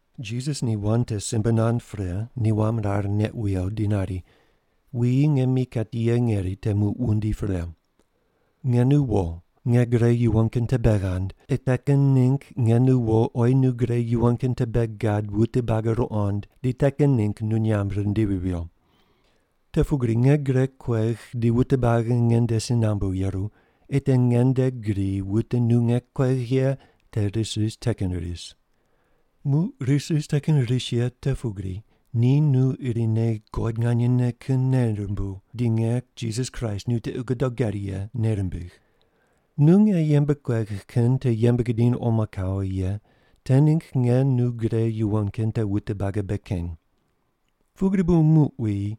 Jisas ni wand te simbe nand pre, ni wam rar neq wiyo di nari, “Wuyi nge mi kati ye ngeri te muq wundi pre. Nge nu wo, nge gre yuwon kin te bei ghand, ei te kin ningg nge nu wo oyi nu gre yuwon kin te bei gad wute buagi ruqond di te kin ningg nu nyamb rindivi viyo. Te pugri nge gre kuegh di wute buagi nge nde si nambu yeru, ei te nge nde gri wute nu nge kuegh ye te ris ris te kin ris. Muq ris ris te kin ris ye te pugri ni nu irine God nganyene kin nei rumbuw, di nge Jisas Kraist nu tiqi gudogh gadi ye nei rimbigh. Nu nge yembe kuegh kin te yembe gidiny omo kawo ye te ningg nge nu gre yuwon kin te wute buagi bei keny. Pugri bu muq, wuyi,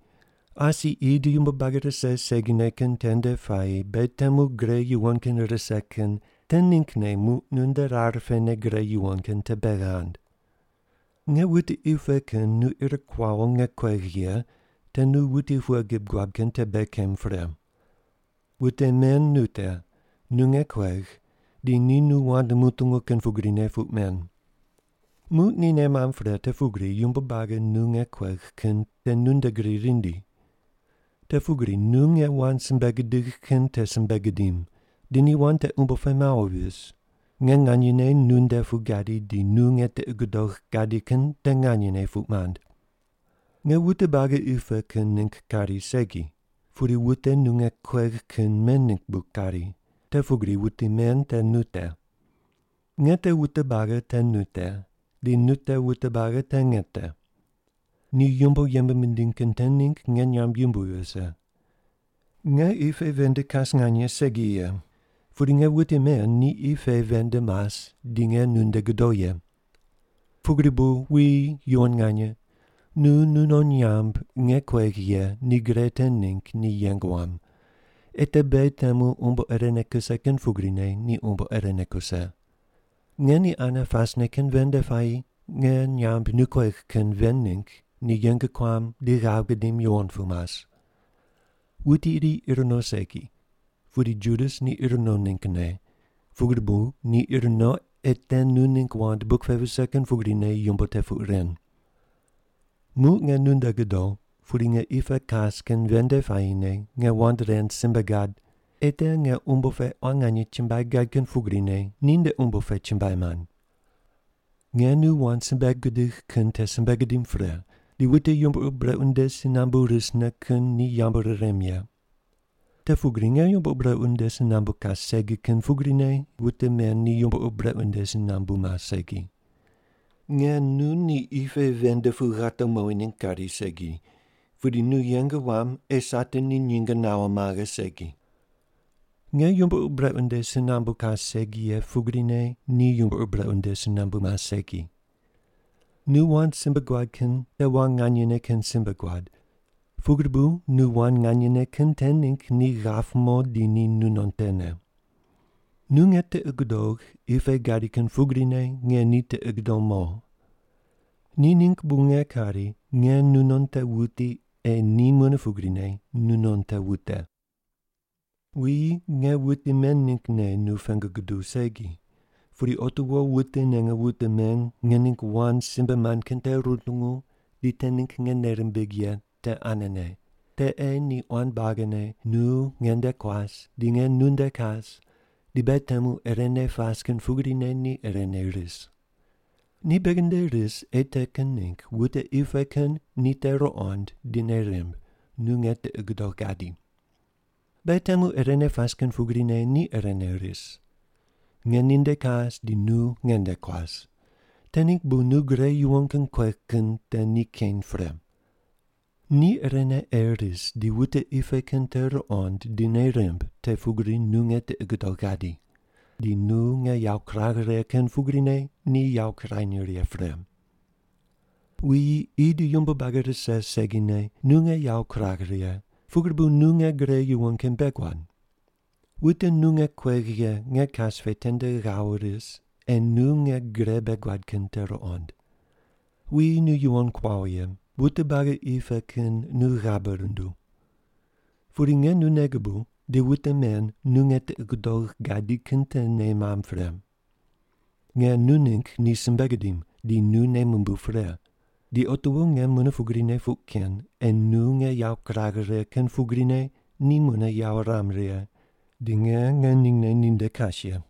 asi qi di yumbo buagi rise segine kin tende puayi beghi temu gre yuwon kin rise kin te ninggne muq nunde rar pene gre yuwon kin te bei ghand. “Nge wute qi pe kin nu ir kuawo nge kuegh ye te nu wuti pughe gib guab kin te bei kem pre. Wute men nu te, nu nge kuegh, di ni nu wand mutungu kin pugrine puq men. Muq ni nei mamb pre te pugri yumbo buagi nu nge kuegh kin te nunde gri rindi. Te pugri nu nge wand simbe gudigh kin te simbe gidim, di ni wand te umbo pe mawo vis, nge nganyene nunde pu gadi di nu nge tiqi gudogh gadi kin te nganyene puq mand. Nge wute buagi qi pe kin ningg kari segi, pudi wute nu nge kuegh kin men ningg bu kari, te pugri wute men te nu te. Nge te wute buagi te nu te, di nu te wute buagi te nge te. Ni yumbo yembe mindiny kin te ningg nge nyamb yumbui vise. Nge qi pe ven nde kas nganye segi ye, pudi nge wute men ni qi pe ven nde mas di nge nunde godo ye. Pugri bu, wuyi yuwon nganye, nu nunon nyamb nge kuegh ye ni gre te ningg ni yeng wam, ei te beghi temu umbo irene kuse kin pugrine ni umbo irene kuse. Nge ni ane pasne kin ven nde puayi nge nyamb nu kuegh kin ven ningg ni yeng kuam di ghav gidim yuwon pu mas. Wuti iri ir no segi, pudi Judas ni ir no ninggne, pugri bu ni ir no ei te nu ningg wand buk pe vise kin pugrine yumbo te puq ren. “Muq nge nunde godo, pudi nge qi pe kas kin ven nde puayine nge wand ren simbe gad, ei te nge umbo pe quan nganye chumbuai gad kin pugrine ninde umbo pe chumbuai mand. Nge nu wand simbe gudigh kin te simbe gidim pre di wute yumbo ur brequ nde si nambu risne kin ni yambu rirem ye. Te pugri nge yumbo ur brequ nde si nambu kas segi kin pugrine wute men ni yumbo ur brequ nde si nambu mas segi. Nge nu ni qi pe ven nde pu ghate mowi ningg kari segi, pudi nu yeng wam ei Satan ni nyinge nawo maghe segi. Nge yumbo ur brequ nde si nambu kas segi ye pugrine ni yumbo ur brequ nde si nambu mas segi. Nu wand simbe guad kin te wand nganyene kin simbe guad, pugri bu nu wand nganyene kin te ningg ni ghap mo di ni nunon tene. Nu nge tiqi gudogh qi pe gadi kin pugrine nge ni tiqi gudom mo. Ni ningg bu nge kari nge nunon te wuti ei ni mune pugrine nunon te wute. “Wuyi, nge wute men ninggne nu pengu guduw segi, pudi otiwo wute ninge wute men nge ningg wand simbe mand kin te rutungu di te ningg nge nei rimbigh ye te anene, te ei ni quan buagine nu nge nde kuas di nge nunde kas di beghi temu irene pas kin pugrine ni irene ris. Ni beghi nde ris ei te kin ningg wute qi pe kin ni te ruqond di nei rimb, nu nge tiqi gudogh gadi. Beghi temu irene pas kin pugrine ni irene ris, nge ninde kas di nu ngende kuas, te ningg bu nu gre yuwon kin kuegh kin te ni keny pre. Ni irene ei ris di wute qi pe kin te ruqond di nei rimb te pugri nu nge tiqi gudogh gadi, di nu nge yawo kuragh righe kin pugrine ni yawo kurany righe pre. “Wuyi, qi di yumbo buagi rise segine nu nge yawo kuragh righe, pugri bu nu nge gre yuwon kin bei guad. Wute nu nge kuegh ye nge kas pe tende ghawo ris ei nu nge gre bei guad kin te ruqond. Wuyi, nu yuwon kuawo ye, wute buagi qi pe kin nu ghabe runduw. Pudi nge nu nei gubuw, di wute men nu nge tiqi gudogh gadi kin te nei mamb pre. Nge nu ningg ni simbe gidim di nu nei mumbuw pre, di otiwo nge mune pugrine puq ken, ei nu nge yawo kuragh righe kin pugrine ni mune yawo ram righe, di nge ngeningne ninde kas ye.”